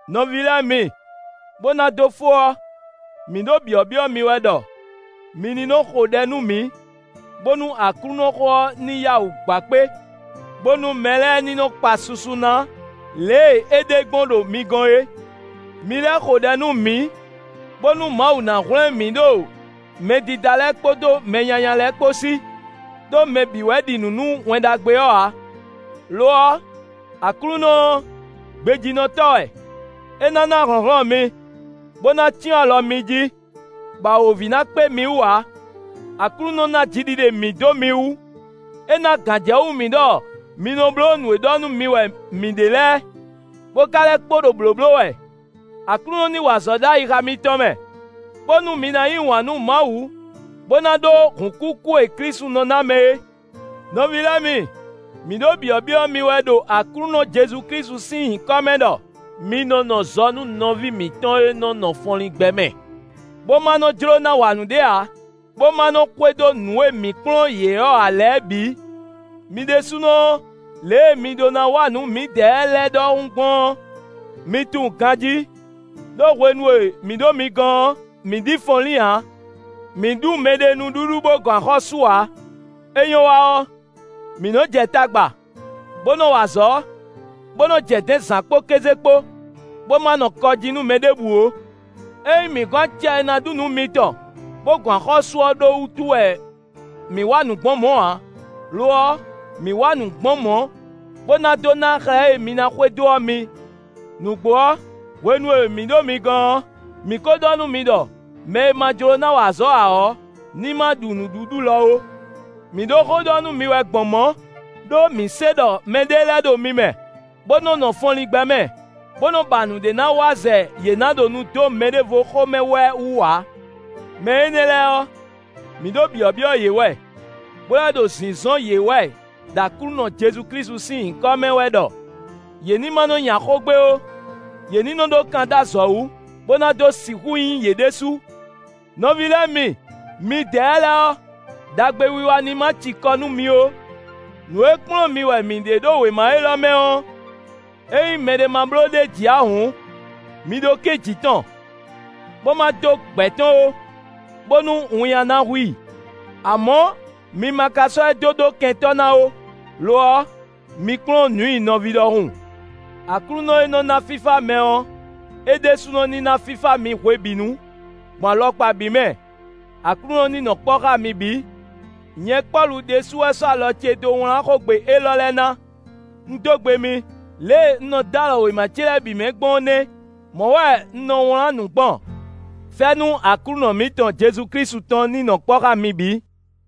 Nɔví lɛ́ɛ mi, bó ná dó fó ɔ́, mǐ ɖo byɔ̌byɔ́ mi wɛ ɖɔ mi ní nɔ xo ɖɛ nú mǐ, bónú Aklúnɔxó ɔ́ ní yá wǔ gba kpé, bónú mɛ lɛ́ɛ ní nɔ kpa susu ná lě e é ɖe gbɔn ɖo mi gɔ́n é. Mi lɛ́ xo ɖɛ nú mǐ, bónú Mawu ná hwlɛ́n mǐ ɖo mɛdídá lɛ́ɛ kpódó mɛ nyanya lɛ́ɛ kpó sí; ɖó mɛ bǐ wɛ ɖi nǔ nú Wɛn Ɖagbe ɔ́ ǎ. Lo ɔ́, Aklúnɔ ɔ́, gbejínɔtɔ́ wɛ; é ná ná hlɔ̌nhlɔ́n mi, bó ná cyɔ́n alɔ mi jí, bɔ awǒvi ná kpé mi wú ǎ. Aklúnɔ ná jiɖiɖe mǐ dó mi wú; é ná gǎnjɛwú mǐ ɖɔ mi nɔ bló nǔ e ɖɔ nú mi wɛ mǐ ɖe lɛ́ɛ, bó ka lɛ́ kpo ɖo blǒbló wɛ. Aklúnɔ ní wa azɔ̌ ɖo ayixa mitɔn mɛ, bónú mi ná yí wǎn nú Mawu bó ná ɖó hǔnkúkú e Klísu nɔ ná mɛ é. Nɔví lɛ́ɛ mi, mǐ ɖo byɔ̌byɔ́ mi wɛ ɖo Aklúnɔ Jezu Klísu sín nyǐkɔ mɛ ɖɔ mi nɔ nɔ zɔ nú nɔví mǐtɔn e nɔ nɔ fɔnlín gbɛ mɛ, bó ma nɔ jló ná wa nǔɖé ǎ, bó ma nɔ xwedó nǔ e mǐ kplɔ́n yě ɔ́ ǎ lɛ́ɛ bǐ. Mi ɖésúnɔ ɔ́, lě e mi ɖó ná wa nǔ mǐdɛɛ lɛ́ɛ ɖɔhun gbɔn ɔ́, mi tunwun ganjí; ɖó hwenu e mǐ ɖo mi gɔ́n ɔ́, mǐ ɖi fɔnlín ǎ. Mǐ ɖu mɛɖé nǔɖuɖu bó gɔn axɔ́ sú ǎ; é nyɔ́ wa ɔ́, mǐ nɔ́ jɛ tagba, bó nɔ wa azɔ̌, bó nɔ jɛ dɛ̌n zǎn kpó kéze kpó, bó ma nɔ kɔ jí nú mɛ ɖěbǔ ó. É nyí mǐ gɔn acɛ e ná ɖu nǔ mitɔn bó gɔn axɔ́ sú ɔ́ ɖó wútu wɛ mǐ wa nǔ gbɔn mɔ̌ ǎ; lo ɔ́, mǐ wa nǔ gbɔn mɔ̌, bó ná dó ná xlɛ́ e mi ná xwedó ɔ́ mi. Nǔgbó ɔ́, hwenu e mǐ ɖo mi gɔ́n ɔ́, mǐ ko ɖɔ nú mi ɖɔ mɛ e ma jló ná wa azɔ̌ ǎ ɔ́, ní ma ɖu nǔɖuɖu lɔ ó. Mǐ ɖo xó ɖɔ nú mi wɛ gbɔn mɔ̌, ɖó mǐ se ɖɔ mɛɖé lɛ́ɛ ɖo mi mɛ, bó nɔ nɔ fɔnlín gbɛ mɛ, bó nɔ́ ba nǔɖé ná wa zɛ yě ná ɖo nu dó mɛɖěvo xó mɛ wɛ wú ǎ. Mɛ énɛ́ lɛ́ɛ ɔ́, mǐ ɖo byɔ̌byɔ́ yě wɛ, bó lɛ́ ɖo zǐnzɔ́n yě wɛ ɖo Aklúnɔ Jezu Klísu sín nyǐkɔ mɛ wɛ ɖɔ yě ní ma nɔ nya xó gbé ó; yě ní nɔ ɖó kan dó azɔ̌ wú, bó ná dó sixú nyí yě ɖésú. Nɔví lɛ́ɛ mi, midɛɛ lɛ́ɛ ɔ́, ɖagbewiwa ní ma ci kɔ nú mi ó. Nǔ e kplɔ́n mi wɛ mǐ ɖe ɖo wěma élɔ́ mɛ ɔ́, ényí mɛɖé ma bló ɖ'é jí ǎ hǔn, mi ɖó kɛ́n jǐ tɔn, bó ma dó gbɛ̌ tɔn ó, bónú winnyá ná hu i. Amɔ̌ mi ma ka sɔ́ ɛ dó ɖó kɛntɔ́ na ó; lo ɔ́, mi kplɔ́n nǔ i nɔví ɖɔhun. Aklúnɔ e nɔ́ ná fífá mɛ ɔ́, é ɖésúnɔ ní ná fífá mi hwebǐnu, gbɔn alɔkpa bǐ mɛ. Aklúnɔ ní nɔ kpɔ́ xá mi bǐ. Nyɛ Pɔ́lu ɖésú wɛ sɔ́ alɔ ce dó wlán xógbe élɔ́ lɛ́ɛ ná: un dó gbe mi; lě e un nɔ dó alɔ wěma ce lɛ́ɛ bǐ mɛ gbɔn ɔ́ nɛ́; mɔ̌ wɛ un nɔ wlán nǔ gbɔn. Fɛ́nú Aklúnɔ mǐtɔn Jezu Klísu tɔn ní nɔ kpɔ́ xá mi bǐ.